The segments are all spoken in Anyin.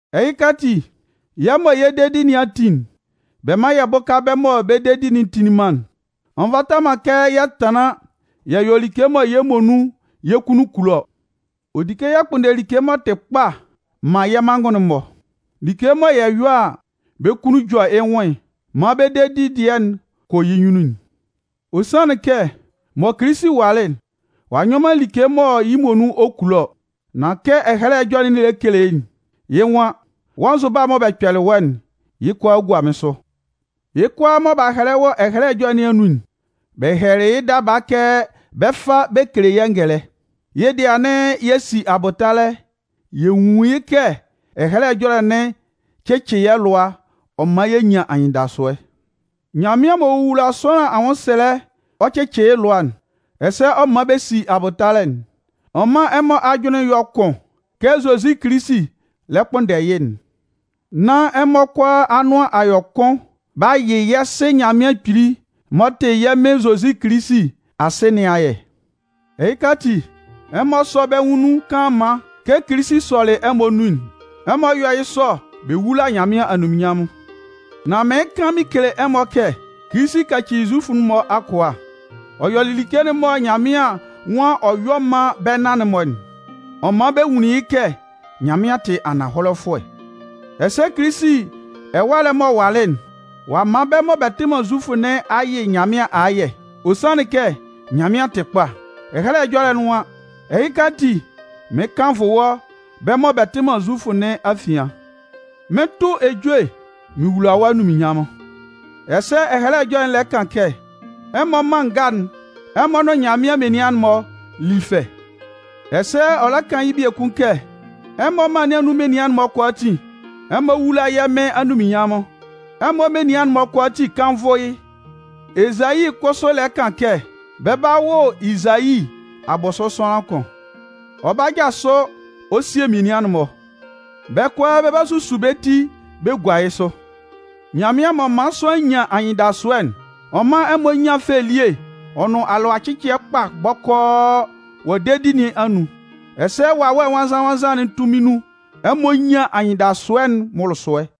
Ɛhɩka ati, yɛ́ mɔ yɛ́ dedi nɩn a tin'n, bɛ mán yɛ bʋ́ka bɛ́ mɔ bɛ́ dedi'n tinlin man'n. Ɔ nvata man kɛ yɛ tanlan yɛ yɔ like mɔ yɛ́ muonun yɛ́ kunnun kulo ɔ. Ɔ di kɛ yɛ kpʋnndɛ like m'ɔ tɩ kpa man yɛ́ manngʋn'n-mɔ, like mɔ yɛ yɔ a, bɛ́ kunnun jɔ yɩ́ nwʋn maan bɛ́ dedi dɩɛ'n kɔ yɩ́ nyunnun'n. Ɔ sanlɩn kɛ mɔ Kilisi walɩ'n, ɔ'a nyɔ man like mɔ yɩ́ muonun ɔ kulo ɔ. Nan kɛ Ɛhɛlɛ Ɛjɔlɛ'n lɛ kele'n, yɩ́ nwan: Wɔ́ nzʋba mɔ bɛ kpɛlɩ wɔ́'n, yɩ́ kʋalaa gua mɩ́n sʋ. Yɩ́ kʋalaa mɔ b'a hɛlɛ wɔ Ɛhɛlɛ Ɛjɔlɛ nɩn anun'n, bɛ hɛlɛlɩ yɩ́ daba kɛ bɛ 'fa bɛ kele yɛ́ ngɛlɛ. Yɩ́ dɩɛ anɩn yɛ si abʋtalɛ yɛ nwun yɩ́ kɛ Ɛhɛlɛ Ɛjɔlɛ'n cɩcɩ yɛ́ lʋa ɔ man yɛ nyan anyɩndasʋɛ. Nyanmɩan m'ɔ wowula sʋanlan anwʋnsɛlɛ ɔ cɩcɩ yɩ́ lʋa, ɛsɛ ɔ man bɛ si abʋtalɛ'n, ɔ mán ɛmɔ ajʋnlɩn yɔ́ kʋn kɛ Zozi Kilisi lɛ kpʋnndɛ yɩ́'n, nán ɛmɔ kʋalaa anʋan a yɔ kʋn b'a yɩ yɛ́ Sɩ Nyanmɩan Kpili m'ɔ tɩ yɛ́ Mɩn Zozi Kilisi Asɩ nɩn ayɛ. Ɛhɩka ati, ɛmɔ sɔ́ bɛ́ nwʋn nun kanlanman kɛ Kilisi sɔlɩ ɛmɔ nun'n. Ɛmɔ yɔ́ yɩ́ sɔ bɛ wúla Nyanmɩan anunminnyanmʋn. Nan mɩɩn kan mɩn kele ɛmɔ kɛ, Kilisi kacili Zufʋ'n-mɔ akʋa. Ɔ yɔlɩ like'n mɔ Nyanmɩan nwan ɔ 'yɔ man bɛ́ nan-mɔ'n. Ɔ man bɛ nwunlin yɩ́ kɛ Nyanmɩan tɩ ananhɔlɛfʋɛ. Ɛsɛ Kilisi ɛwalɛ m'ɔ walɩ'n, ɔ'a man bɛ́ mɔ bɛ tɩ man Zufʋ nɩn a yɩ́ Nyanmɩan ayɛ, ɔ sanlɩn kɛ Nyanmɩan tɩ kpa. Ɛhɛlɛ Ɛjɔlɛ'n nwan: Ɛhɩka ati, mɩn 'kannvʋ wɔ́ bɛ́ mɔ bɛ tɩ man Zufʋ nɩn afian. Mɩn 'tʋ ejue mɩn wula wɔ́ anunminnyanmʋn. Ɛsɛ Ɛhɛlɛ Ɛjɔlɛ'n lɛ kan kɛ: Ɛmɔ mân nga'n, ɛmɔ nʋn Nyanmɩan menian'n-mɔ lí fɛ! Ɛsɛ ɔ lɛ kan yɩ́ biekun kɛ: Ɛmɔ mân nɩn anun menian'n-mɔ kʋalaatin, ɛmɔ wúla yɛ́ Mɩn anunminnyanmʋn, ɛmɔ menian'n-mɔ kʋalaatin kánnvʋ yɩ́! Ezayi kʋsʋ lɛ kan kɛ: Bɛ 'ba wʋ Izayi abʋsʋ sʋanlan kʋn. Ɔ 'ba jasʋ ɔ sie menian'n-mɔ. Bɛ́ kʋalaa bɛ 'ba susu bɛ́ ti bɛ gua yɩ́ sʋ. Nyanmɩan m'ɔ man sʋanlan nyan anyɩndasʋɛ'n, ɔ mán ɛmɔ nyán fɛ elie ɔ nʋn alʋacɩcɩɛ kpa bɔkɔɔ wɔ dedi nɩn anun. Ɛsɛ Wawɛ Nwannzan-nwannzan'n tunmin nun, ɛmɔ nyán anyɩndasʋɛ'n mʋlʋsʋɛ.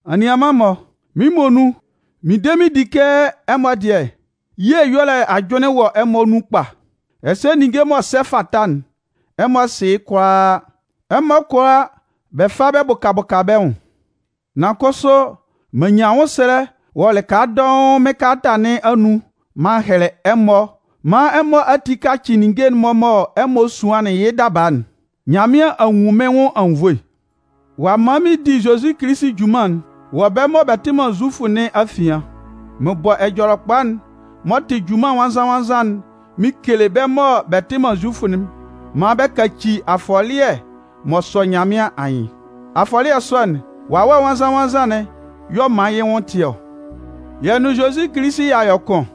Anianman-mɔ, mɩ́n muonun, mɩn de mɩn di kɛ ɛmɔ dɩɛ, ye ɛyɔlɛ ajʋnlɩn wɔ ɛmɔ nun kpa. Ɛsɛ ninnge m'ɔ sɛ fata'n, ɛmɔ sɩ yɩ́ kʋalaa, ɛmɔ kʋala bɛ fa bɛ bʋka bʋka bɛ́ nwʋn. Nan kʋsʋ, m'an nyan anwʋnsɛlɛ wɔ lɩka dɔʋn mɩ́n kalata nɩn anun m'an hɛlɛ ɛmɔ maan ɛmɔ ati kacɩ ninnge'n mɔ ɛmɔ suanlɩn yɩ́ daba'n. Nyanmɩan a nwun mɩ́n nwʋn anwunnvoe ɔ'a man mɩn di Zozi Kilisi junman'n wɔ bɛ́ mɔ bɛ tɩ man Zufʋ nɩn afian. Mɩn bɔ Ɛjɔlɛkpa'n m'ɔ tɩ junman nwannzan-nwannzan'n mɩn kele bɛ́ mɔ bɛ tɩ man Zufʋ'n maan bɛ kaci afɔlɩɛ m'ɔ sɔ Nyanmɩan anyɩn. Afɔlɩɛ sɔ'n, Wawɛ Nwannzan-nwannzan'n y'ɔ man yɩ́ nwʋn tɩ ɔ. Yɛ́ nʋn Zozi Kilisi y'a yɔ kʋn.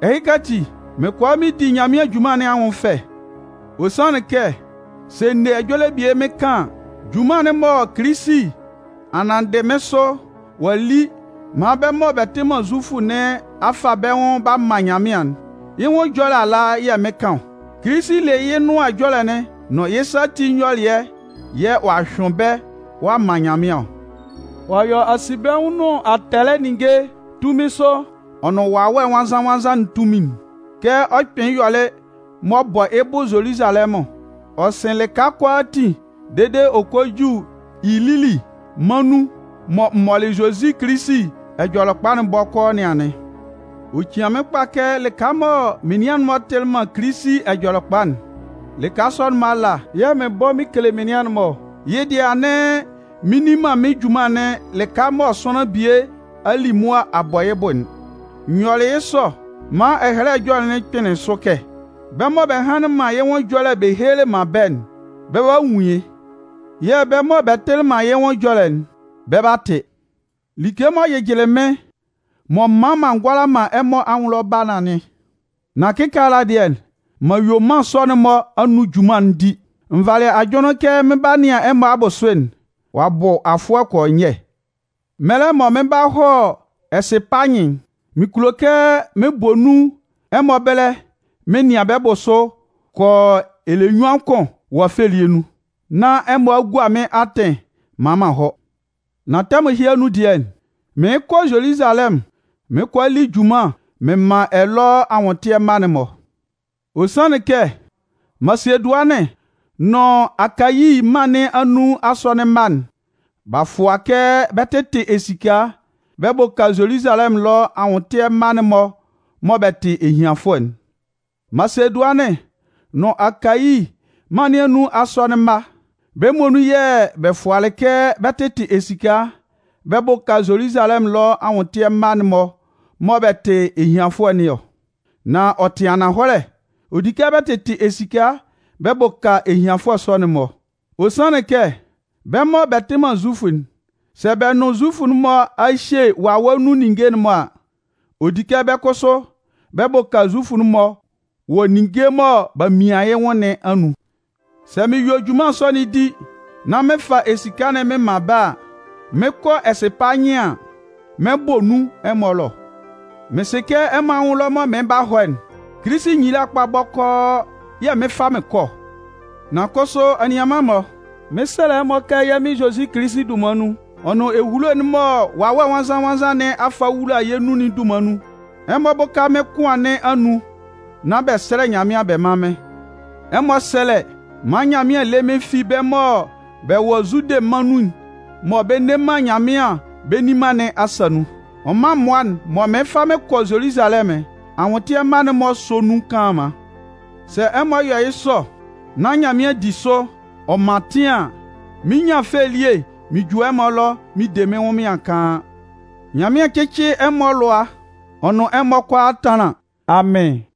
Ɛhɩka ati, mɩn kʋala mɩn di Nyanmɩan junman nɩn anwʋn fɛ. Ɔ sanlɩn kɛ sɛ n ne ɛjɔlɛ bie mɩn kan an, junman'n mɔ Kilisi a nanndɩ mɩn sʋ ɔ'a li maan bɛ́ mɔ bɛ tɩ man Zufʋ nɩn a fa bɛ́ nwʋn b'a man Nyanmɩan'n, yɩ́ nwʋn ɛjɔlɛ ala yɛ̂ mɩn 'kan ɔ. Kilisi le yɩ́ Nʋan Ɛjɔlɛ'n nʋn yɩ́ sa ati nyɔlɩɛ'n yɛ̂ ɔ'a hyʋɩn bɛ́ ɔ'a man Nyanmɩan ɔ. Ɔ'a yɔ asinbɛnwʋn nʋn atɛlɛ ninnge tunmin sʋ ɔ nʋn Wawɛ Nwannzan-nwannzan'n tunmin'n. Kɛ ɔ kpɩnlɩn yɔlɩ m'ɔ bɔ yɩ́ bʋ Zoluzalɛmʋn, ɔ sɩn lɩka kʋalaatin dede ɔ kɔ ju Ilili mân nun mɔ n mɔlɩ Zozi Kilisi Ɛjɔlɛkpa'n bɔkɔɔ nɩn anɩn. Ɔ cian mɩ́n kpa kɛ lɩka mɔ menian'n-mɔ tɩlɩ man Kilisi Ɛjɔlɛkpa'n, lɩka sɔ'n-mɔ ala yɛ̂ mɩn bɔ mɩn kele menian'n-mɔ ɔ. Yɩ́ dɩɛ anɩn mɩn nni man mɩ́n junman'n lɩka mɔ sʋanlan bie a li mʋa a bɔ yɩ́ bʋ'n. N yɔlɩ yɩ́ sɔ maan Ɛhɛlɛ Ɛjɔlɛ'n kpɩnlɩn sʋ kɛ: Bɛ́ mɔ bɛ hanlɩn man yɩ́ nwʋn ɛjɔlɛ bɛ helelɩ man bɛ́'n, bɛ 'ba nwun yɩ́. Yɛ̂ bɛ́ mɔ bɛ tɩlɩ man yɩ́ nwʋn ɛjɔlɛ'n bɛ 'ba tɩ. Like m'ɔ jɩjɩlɩ mɩ́n m'ɔ man m'an ngʋala man ɛmɔ anwʋn ɛlɔ ba nɩn anɩn. Nan kɩkaala dɩɛ, m'an yue mân sɔ'n-mɔ anun junman'n di. N valɩ ajʋnlɩn kɛ mɩn 'ba nɩan ɛmɔ abʋsʋ'n, ɔ'a bʋ afʋɛ kɔ y ɔ nyɛ. Mɛlɛ mɔ mɩn 'ba hɔ Ɛsɩpanyɩn'n, mɩn kulo kɛ mɩn bɔ nun ɛmɔ ɛbɛlɛ mɩn nɩan bɛ́ bʋsʋ kɔ yɔ ɛlɛnyuan kʋn wɔ fɛ elie nun, nán ɛmɔ a gua mɩ́n atɩn maan m'an hɔ. Nan tɛmʋn ɛhɩ anun dɩɛ, mɩɩn kɔ Zoluzalɛmʋn mɩn 'kɔ a li junman mɩn man ɛlɔ anwʋntɩɛ mma'n-mɔ. Ɔ sanlɩn kɛ Masedʋanɩn nʋn Akayi mân nɩn anun asɔnɩn mma'n, b'a fua kɛ bɛ 'tɩtɩ esika bɛ bʋka Zoluzalɛmʋn ɛlɔ anwʋntɩɛ mma'n-mɔ mɔ bɛ tɩ ehianfʋɛ'n. Masedʋanɩn nʋn Akayi mân nɩn anun asɔnɩn mma'n, bɛ́ muonun yɛ̂ bɛ fualɩ kɛ bɛ 'tɩtɩ esika bɛ bʋka Zoluzalɛmʋn ɛlɔ anwʋntɩɛ mma'n-mɔ mɔ bɛ tɩ ehianfʋɛ nɩn ɔ. Nan ɔ tɩ ananhɔlɛ, ɔ di kɛ bɛ tɩtɩ esika bɛ bʋka ehianfʋɛ sɔ'n-mɔ. Ɔ sanlɩn kɛ, bɛ́ mɔ bɛ tɩ man Zufʋ'n, sɛ bɛ nʋn Zufʋ'n-mɔ a hye wawɛ nun ninnge'n-mɔ a, ɔ di kɛ bɛ́ kʋsʋ bɛ bʋka Zufʋ'n-mɔ wɔ ninnge mɔ b'a mian yɩ́ nwʋn nɩn anun. Sɛ mɩn yue junman sɔ'n di, nán mɩn fa esika'n mɩn man bɛ́ a, mɩn 'kɔ Ɛsɩpanyɩn an, mɩn 'bɔ nun ɛmɔ ɛlɔ. Mɩn sɩ kɛ ɛmɔ anwʋn ɛlɔ mɔ mɩn 'ba hɔ'n, Kilisi nyila kpa bɔkɔɔ yɛ̂ mɩn 'fa mɩn kɔ ɔ. Nan kʋsʋ anianman-mɔ, mɩn 'sɛlɛ ɛmɔ kɛ yɛ́ mɩn Zozi Kilisi dunman nun, ɔ nʋn ehulo'n mɔ Wawɛ Nwannzan-nwannzan nɩn a fa a wula yɛ́ nun'n dunman nun, ɛmɔ bʋ́ka mɩ́n kʋan nɩn anun nán bɛ sɛ́lɛ Nyanmɩan bɛ mán mɩ́n. Ɛmɔ sɛ́lɛ maan Nyanmɩan lé mɩ́n fi bɛ́ mɔ bɛ wɔ Zude mân nun mɔ bɛ nne man Nyanmɩan bɛ nni man nɩn asa nun. Ɔ mán mmʋa'n mɔ mɩɩn fa mɩn kɔ Zoluzalɛmʋn'n, anwʋntɩɛ mma'n-mɔ sɔ́ nun kanlanman. Sɛ ɛmɔ yɔ yɩ́ sɔ nán Nyanmɩan di sʋ ɔ man atɩn an, mɩn 'nyan fɛ elie mɩn ju ɛmɔ ɛlɔ mɩn de mɩ́n ɛnwʋnmɩan kaan. Nyanmɩan cɩ́cɩ ɛmɔ alʋa, ɔ nʋn ɛmɔ kʋalaa tánlan. Amɩn.